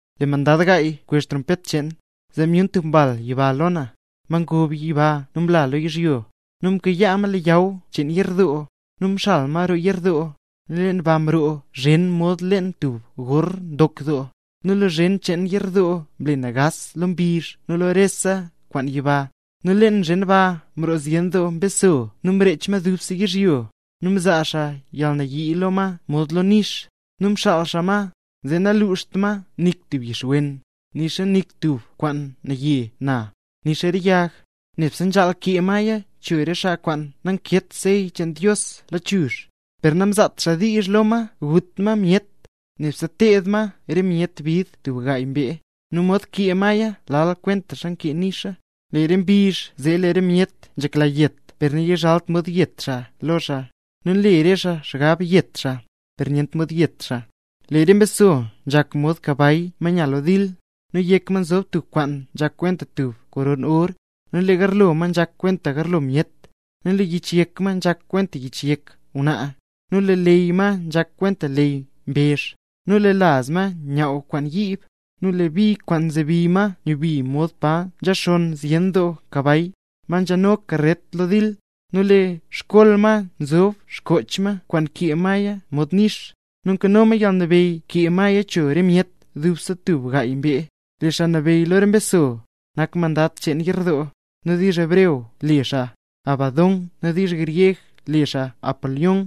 Lee mandad gaay mkwezh trompet cheen, zee myun tub mbal yiba lo na, ma ngob yiba nu mla lo yizhyo, nu mkayaa ma leyaw cheen yerdoo. Nu mxal ma roo yerdoo, nu leen ba mroo zhen mod leen tub gor ndok doo. Nu lee zhen cheen yerdoo mle nagaas lo mbizh nu lo rese kwaan yiba. Nu leen zhen ba mroo zyen doo mbeso nu mrech ma dubse yizhyo; nu mzaa xaa yalnayii lo ma mod lo nix. Nu mxaal xaa ma, zee nanluuxt ma nik tub yix wen, nixa nik tub kwaan naye na, nixa re yag; nebse nzhaal kee maya cho re xaa kwaan nankeet sey cheen Dios lachuzh. Per namzaat xaa diizh lo ma gut ma myet, nebse teed ma re myet bid tub gaay mbee; nu mod nkee maya lal kwentaxa nkee nixa. Lee re mbizh zee lee re myet nzhekla yet per nayizhalt mod yet xaa lo xaa; nu nle re xaa xgab yet xaa, per nyent mod yet xaa. Lee re mbeso nzhak mod kabay ma nya lo dil; nu yek ma nzob tub kwaan nzhak kwenta tub koron or, nu lee garlo ma nzhak kwenta garlo myet. Lee yich yek ma nzhak kwenta yich yek ngwnaa, nu lee leyy ma nzhak kwenta leyy mbezh. Lee laz ma nyaaw kwaan yiib, nu lee bi kwaan nzebi ma nyubi mod pa nzhaxonn zyen doo kabay, ma nzhano karret lo dil. Nu lee xkol ma nzob xkoch ma kwaan nkee maya mod nix, nu nkano ma yalnabeyy kee maya cho re myet dubse tub gaay mbee. Lee xaa nabeyy lo re mbeso, nak mandad cheen yerdoo; nu diizh hebreo le xaa Abadón nu diizh gryeg le xaa Apolión.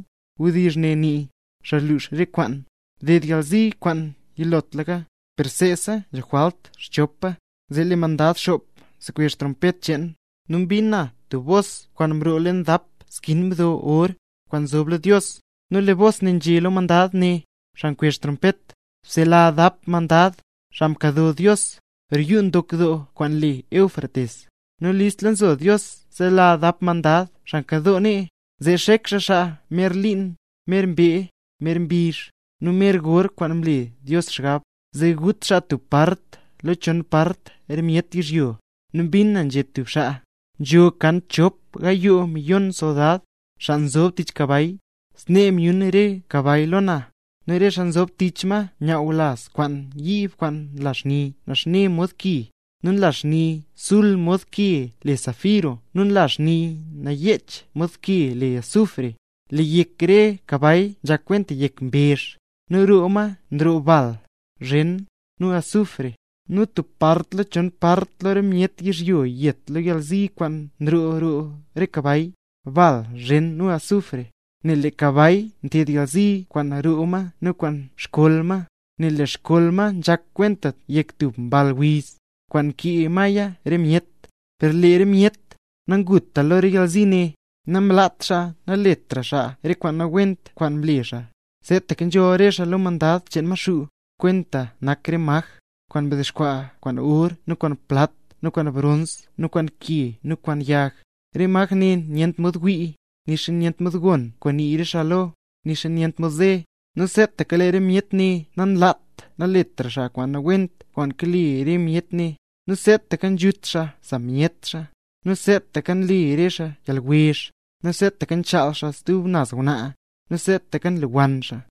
(Wdizh ne nii: “Xaa nlux rese kwaan”.) Mded yalzi kwaan yilotlaka, per seesa nzho jwalt xchopa. Zee lee mandad xop mkwezh trompet cheen, nu mbin na tub bos kwaan mroo leen dap skin mdo or, kwaan nzob lo Dios. Nu lee bos nzhé lo mandad ne, xaa mkwezh trompet: —Bsela dap mandad, xaa mkado Dios, roo yuu ndok kwaan le Éufrates. Nu listla nzo Dios sela dap mandad xaa mkadoo nee, zee xek xaa xaa mer liin, mer mbee, mer mbizh, nu mer gor kwaan mlela Dios xgab, zee gut xaa tub part lo chon part re myet yizhyo. Nu mbin na nzhé tub xaa: —Nzho kan chop gayoo miyon soldad, xaa nzob tich kabay. Snee myun re kabay lo na, nu re xaa nzob tich ma nyaaw laz kwaan yiib kwaan nla xni naxne mod ki, nu nla xni sul mod ke le safiro nu nla xni nayech mod ke le azufre. Lee yek re kabay nzhak kwenta yek mbezh, nu roo ma nroo bal, zhen, nu azufre. Nu tub part lo chon part lo re myet yizhyo yet lo re yalzi kwaan nroo roo re kabay: bal, zhen, nu azufre. Nel lee re kabay nted yalzi kwaan roo ma nu kwaan xkol ma; nel lee xkol ma nzhak kwenta yek tub mball wiz, kwaan kee maya re myet. Per lee re myet, xaa nanguta lo re yalzi ne, namlaat xaa naletra xaa re kwaan nawent kwaan nle xaa: seetaka nzholl re xaa lo re mandad cheen Maxuu, kwaan nak re maj, kwaan mdexkwaa kwaan or nu kwaan plat nu kwaan brons nu kwaan ke nu kwaan yag. Re maj ne nyent mod wii, nixa nyent mod gon kwaan nii re xaa lo, nixa nyent mod ze. Nu seetaka lee re myet ne nanlaat naletra xaa kwaan nawent kwaan kale re myet ne; nu seetaka nzhut xaa sa myet xaa, nu seetaka nle xaa re yalwezh, nu seetaka nchaal xaa stub naz ngwnaa, nu seetaka nlewann xaa.